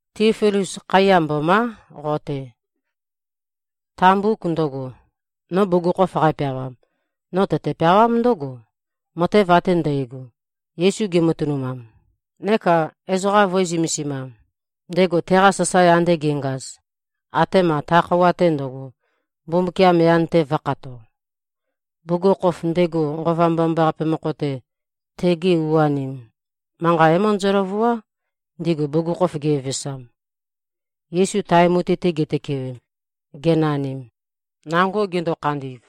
Tíofilus. Khaiya mbomá, qo-te! Ta mbuk ndøgo, no bugukhokhof qæpeawam, no tøtø-peawám ndǿgo, matev ate ndægo, Yesu gematønumam neka ezoqa vø̄e-zømesimam, ndego teqa sasae ande ge꞉ngaz, atema ta khøuwa-te ndøgo, Mbumbukiam yan-te vø̄khato. Bugukhokhof, ndego Nqova Mbomambaqape mokho-te, tegi u-anim, manqa é-møndøzø-løvuá, ndigu bugukhokhof gevevesam. Yesu tae mutui-te gitøkewem, genanim, nango gendo-khandi꞉v,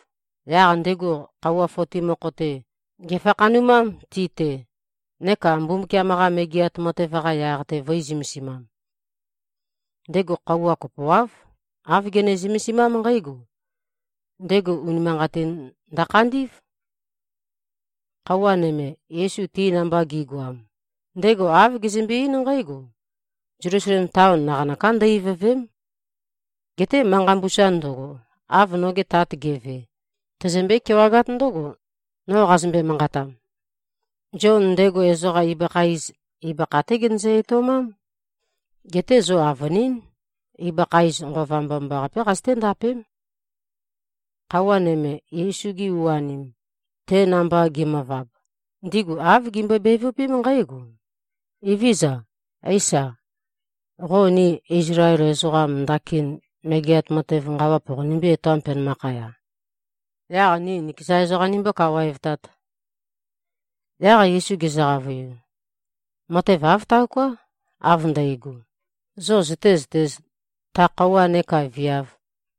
yaq ndego khøuwa foti mokho-te, gèfakhanumám ti-te, neka Mbumbukiam-qa Megeat Matev-qa yaq-te vø̄e-zømesimam. Ndego khøuwa kopoáv, āv gene-zømesimám nqǽgo: Ndego unimanqatin ndøkhandí꞉v. Khøuwa nøme, Yesu ti namba ge꞉goam, ndego āv gezømbe-eín nqǽgo, “Zelusalem taon naqanøká ndø-ivø̀ve᷄m. Geté manqa mbusa ndøgo, av noge Tat ge꞉ve, tozombøé-kewagát ndǿgo, no qazømbe-manqatam. Zion, ndego ezoqa ibøkha iz, ibøkha-té genøzø-etoumám. Geté zo avønín, ibøkha iz, Nqova Mbomambaqapé qazøté-ndapém.” Khøuwa nøme, Yesu-gi u-anim, te namba gi꞉møvab, ndigu āv gimbøe-bevøpém nqǽgo, “Evézøza. Éisa, qo ni Izlael ezoqam, ndakin megeat matev nqawa poqonimbí-etoām, penømakhaya, yaq ni nikeza ezoqam nimbō-kawaevtāt?” Yaq Yesu gezø-qavøiu, “Matev āv taoká, av ndægo, zo zøtēzøtēz, ta khøuwa neka viav,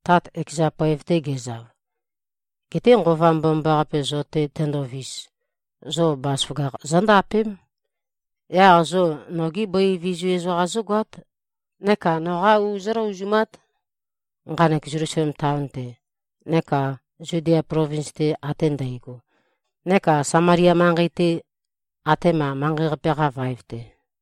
Tat ekeza poev-te gezav. Geté Nqova Mbomambaqape zo-te tendovis, zo bazaføgakh zóndapém. Yaq zo nogi bøi vizu ezoqam zógoát, neka noqá u zóløozumát, nqanek Zelusalem taon-te, neka Zudia plovins-te ate ndægo, neka Samalia manqei-te, atema manqei-qape-qa vaev-te.”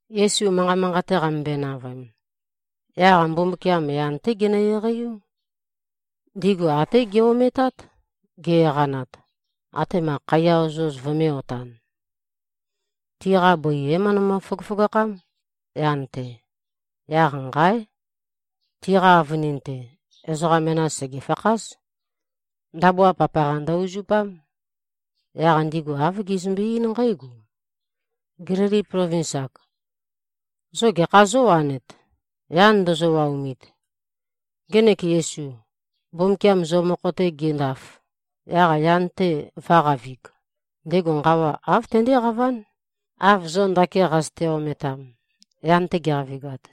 Yesu manqa manqate qamømbøe-navøem, yaq Mbumbukiam yan-té genø-eqeiú. Ndigu até ge-ometát, ge-eqanat, atema khaiya ozoz vømē-otan. Tiqa bøi é-møndømø-føgøføgakhám, yan-te. Yaq nqáe! Tiqa avønin-te, ezoqa menas sègefakház. Ndabua papaqa ndø-uzupám. Yaq ndigu āv gizømbe-eín nqǽgo, “Gélili plovins-ak. Zo gekhá zówanet, yan ndozo-waomit? Ngenek Yesu, Mbumbukiam zo mokho-te gendaf, yaq yan-te vø̄qavig, ndego nqawa āv tendéqaván, av zo ndakin qazøte-ometam, yan-te geqavigat.”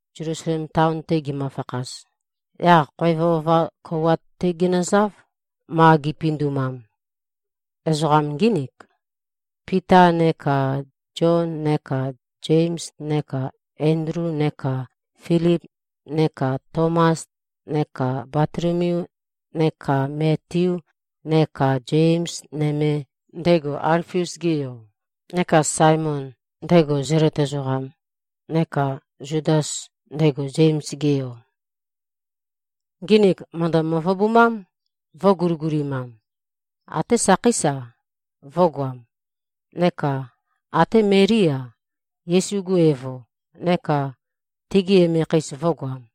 Zelusalem taon-te gimøfakhaz, yaq khoev ova kouwat-té ginøzáv, ma gipindumam. Ezoqam ngínik: Pita neka Zion neka Zems neka Endlu neka Filip neka Tomas neka Batolomeu neka Metiu, neka Zems nøme, ndego Alfius-ge yo, neka Saemon, ndego Zelot ezoqam, neka Zudas, ndego Zems-ge yo. Nginik mø̀ndø-møvøbumám, vø̄guligulimam. Até sakhéis-a, vø̄goam. Neka até Melí-a, Yesu-gu evo, neka tegi emekheis, vø̄goam.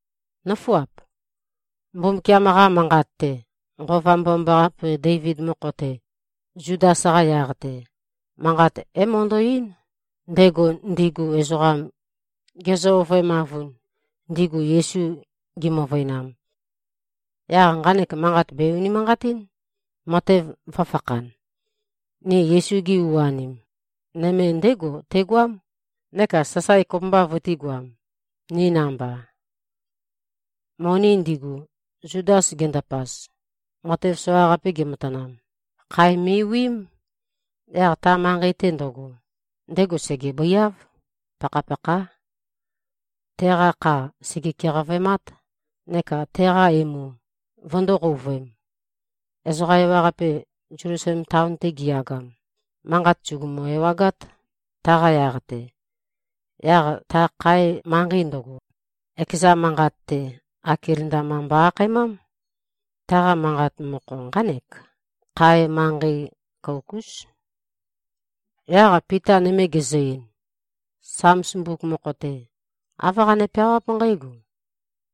“Nǿfuap. Mbumbukiam-qa Manqat-te, Nqova Mbomambaqape Deivid mokho-te, Zudas-qa yaq-te, manqat é-møndo꞉-eín, ndego ndigu ezoqam gezø-ovøemavun, ndigu Yesu gimøvøinam. Yaq nqanek manqat bè-unimanqatín, matev vø̄fakhan. Ni Yesu-gi u-anim, nøme ndégo tegoám, neka sasae kopømba vøtīgoam, ni namba.” (Moni ndigu, Zudas gendapaz, matev soqaqape ge꞉matanam, khae me꞉wiím. Yaq ta manqei-te ndøgo, ndego sègebøiáv. Pakhapakhá. Teqa kha sège-keqavøemát, neka teqa emu vøndō-qouvøem. Ezoqa ewaqape, Zelusalem taon-te giyagam, manqat sùgumu-ewagát, taqa yaq-te. Yaq ta khae manqei ndøgo, ekeza manqat-te, Akeldama mbo-akhaemám. Taqa manqa mokho nqánek, “Khae Manqei Kouk-ús.”) Yaq Pita nøme gezø-ein, “Sams mbuk mokho-te, āv qane-peawáp nqǽgo,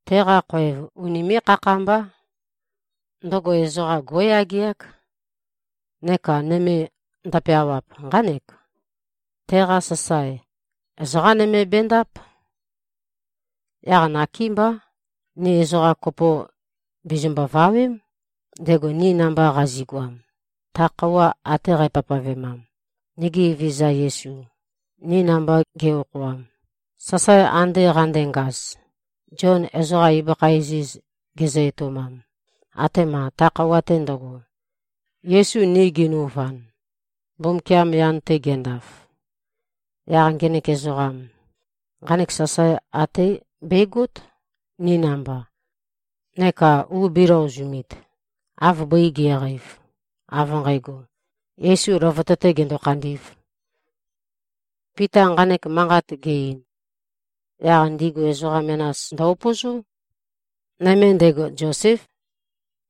‘Teqa khoev unimé꞉-khakhambá. Ndøgo ezoqa gó꞉yageák.’ Neka nøme ndøpeawap, nqánek, ‘Teqa sasae, ezoqá nøme bendáp.’ Yaq nakémbá, ni ezoqa kopo bizimbo-vawém, ndego ni namba qazi꞉goam, ta khøuwa ate qæpavpavemam, nigi Evezøza Yesu, ni namba ge꞉-okhoam, sasae ande qandengaz, Zion ezoqa ibøkha iziz gezø-etoumam, atema ta khøuwa-te ndøgo, Yesu ni genøuvan, Mbumbukiam yan-te gendaf. Yaq ngenek ezoqam, nqanek sasae até begót, ni namba, neka u bēløozumit, av bøi ge꞉qeiv, av nqægo, Yesu løvøte-tē gendo-khandī꞉v.” Pita nqanek manqat ge-ein, yaq ndigu ezoqa menas ndø-upøzó. Nøme ndego, Zoséf.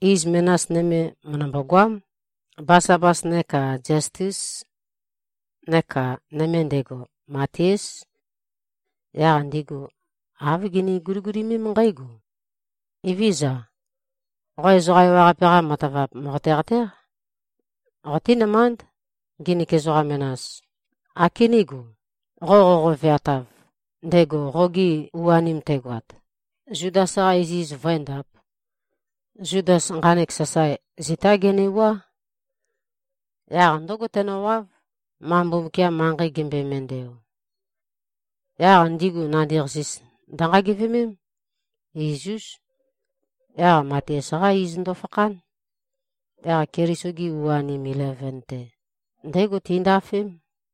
Iz menas nøme mø̀ndømbo-goám, Basabas neka Ziastes. Neka nøme ndego, Matiás. Yaq ndigu āv gini-guligulimém nqǽgo, “Evézøza. Qo ezoqa ewaqape-qa matavap mòqote-qatéq. Qotínømánd, nginik ezoqa menas, ākenégo, qo qoqo-veatav, ndego qoge u-anim tegoat, Zudas-qa iziz vǿendāp. Zudas nqanek sasae, zitá genewuá. Yaq ndǿgo tenøwáv, ma Mbumbukiam manqei gembøe-mendeo.” Yaq ndigu nandi-qasis ndønqagevemém, iz-ús. Yaq Matias-qá iz ndøfakhán. Yaq Keliso-gi u-anim ileven-te, ndégo tindafém.